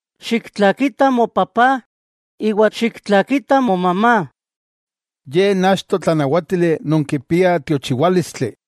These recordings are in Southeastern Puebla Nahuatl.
“Xiktlakita mopapá iwa xiktlakita momamá,” ye n achto tlanawátili non kipia tiochiwálistli,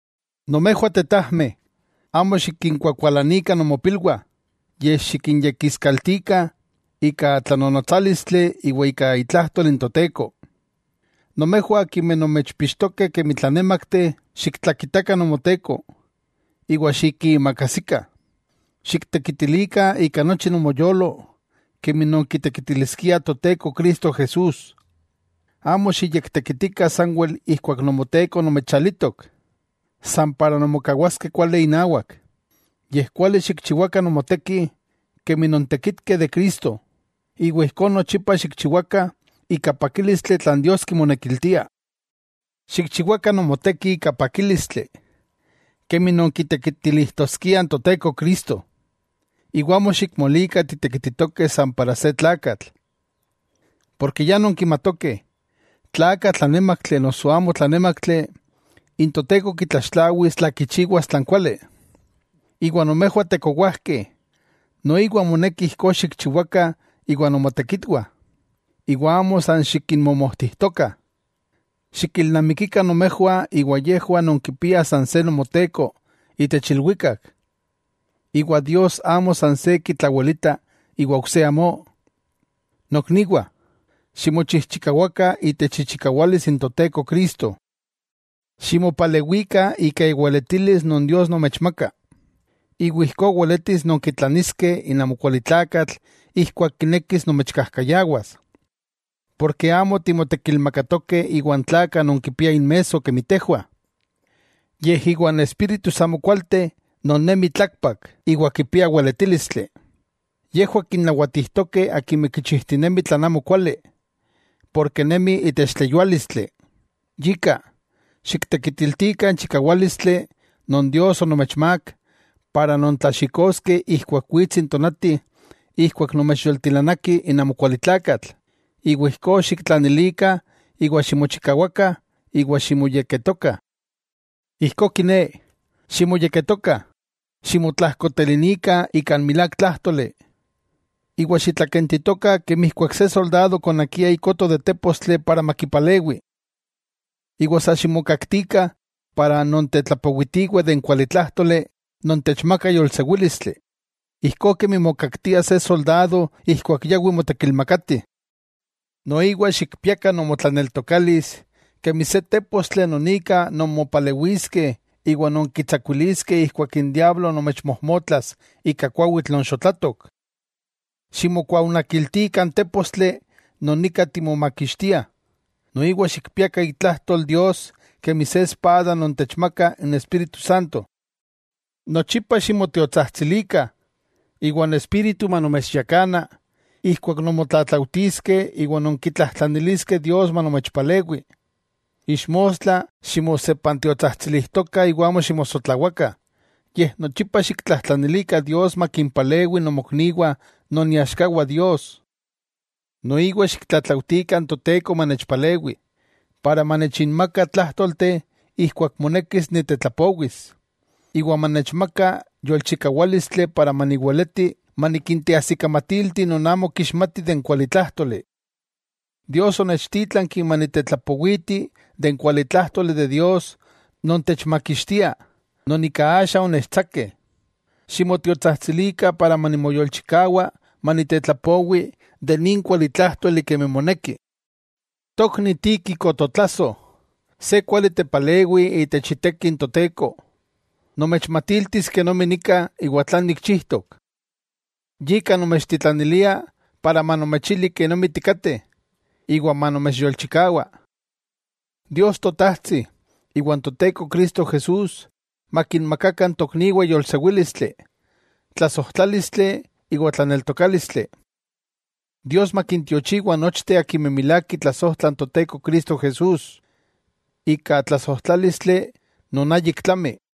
Nomejwah tetajmeh, amo xikinkuakualanikah nomopilwah, yej xikinyekiskaltikah ika tlanonotsálistli iwa ika itlajtol n Toteko. Nomejwah akimeh nomechpixtokeh kemi tlanémakteh, xiktlakitakah nomoteko iwa xikiimakajsikah. Xiktekitilikah ika nochi nomoyolo kemi non kitekitiliskia Toteko Cristo Jesús. Amo xiyektekitikah sanwel ijkuak nomoteko nomechalitok, san para nonmokawaskeh kuali inawak, yej kuali xikchiwakah nomoteki kemi nontekitkeh de Cristo, iwa ijkó nochipa xikchiwakah ika pakílistli tlan Dios kimonekiltia. Xikchiwakah nomoteki ika pakílistli, kemi nonkitekitilijtoskiah n Toteko Cristo, iwa amo xikmolikah titekititokeh san para se tlakatl. Porke ya nonkimatokeh tla aka tlanémaktli noso amo tlanémaktli, n Toteko kitlaxtlawis tla kichiwas tlan kuali. Iwa nomejwah tekowajkeh, noiwa moneki ijkó xikchiwakah iwa nomotekitwah, iwa amo san xikinmomojtijtokah. Xikilnamikikah nomejwah iwa yejwah nonkipiah san se Nomoteko itech ilwikak, iwa Dios amo san se kitlawelita iwa ok se amó. Nokniwah, Ximochijchikawakah itech ichikawalis n Toteko Cristo. Ximopalewikah ika iweletilis non Dios nomechmaka, iwa ijkó weletis nonkitlaniskeh n amokualitlakatl ijkuak kinekis nomechkajkayawas. Porke amo timotekilmakatokeh iwan tlakah non kipiah inmesso kemi tejwah, yej iwan espíritus amokualteh non nemih tlakpak, iwa kipiah weletílistli. Yejwah kinnawatijtokeh akimeh kichijtinemih tlan amokuali ken nemih itech tleyuálistli. Yika, xiktekitiltikah n chikawálistli non Dios onomechmák ika nontlaxikoskeh ijkuak wits n tonati ijkuak nomechyoltilanaki n amokualitlakatl, iwa ijkó xiktlanilikah iwa ximochikawakah iwa ximoyekketokah. Ijkó kiné, ximoyekketokah, ximotlajkotelinikah ika n milák tlájtoli, iwa xitlakentitokah kemi ijkuak se soldado konakia ikoto de tépostli para makipalewi. Sa ximokaktikah para nontetlapowitiweh de n kualitlájtoli non techmaka yolsewílistli, ijkó kemi mokaktia se soldado ijkuak yawi motekilmakati. Noiwa xikpiakah nomotlaneltokalis kemi se tépostli non ika nonmopalewiskeh iwa nonkitsakuiliskeh ijkuak n diablo nomechmojmotlas ika kuawitl non xotlatok. Ximokuaonakiltikah n tépostli non ika timomakixtiah, noiwa xikpiakah itlajtol Dios kemi se espada non techmaka n Espíritu Santo. Nochipa ximotiotsajtsilikah, iwa n Espíritu Santo manomechyakana ijkuak nonmotlatlaujtiskeh iwa nonkitlajtlaniliskeh Dios manomechpalewi. Ixmostla ximosepantiotsajtsilijtokah iwa amo ximosotlawakah, yej nochipa xiktlajtlanilikah Dios makimpalewi nomokniwah non iaxkawah Dios. Noiwa xiktlatlaujtikah n Toteko manechpalewi, iwa manechinmaka tlájtolteh ijkuak monekis nitetlapowis. Iwa manechmaka yolchikawálistli iwa maniweleti manikinteajsikamatilti non amo kixmatih de n kualitlájtoli. Dios onechtítlanki manitetlapowiti de n kualitlájtoli de Dios non techmakixtia non ika axa onechtsakeh. Ximotiotsajtsilikah manimoyolchikawa manitetlapowi nin kualitlájtoli kemi moneki. Tokni Tíquico totlasoj, se kuali tepalewi itech iteki n Toteko nomechmatiltis kenomi nika iwa tlan nikchijtok. Yika nomechtitlanilia para manomechili kenomi tikateh, iwa manomechyolchikawa. Dios Totajtsi, iwa n Toteko Cristo Jesús makinmakakah n tokniwah yolsewílistli, tlasojtlálistli iwa tlaneltokálistli. Dios makintiochiwa nochteh akimeh milák kitlasojtlah n Toteko Cristo Jesús, ika tlasojtlálistli non ayik tlami.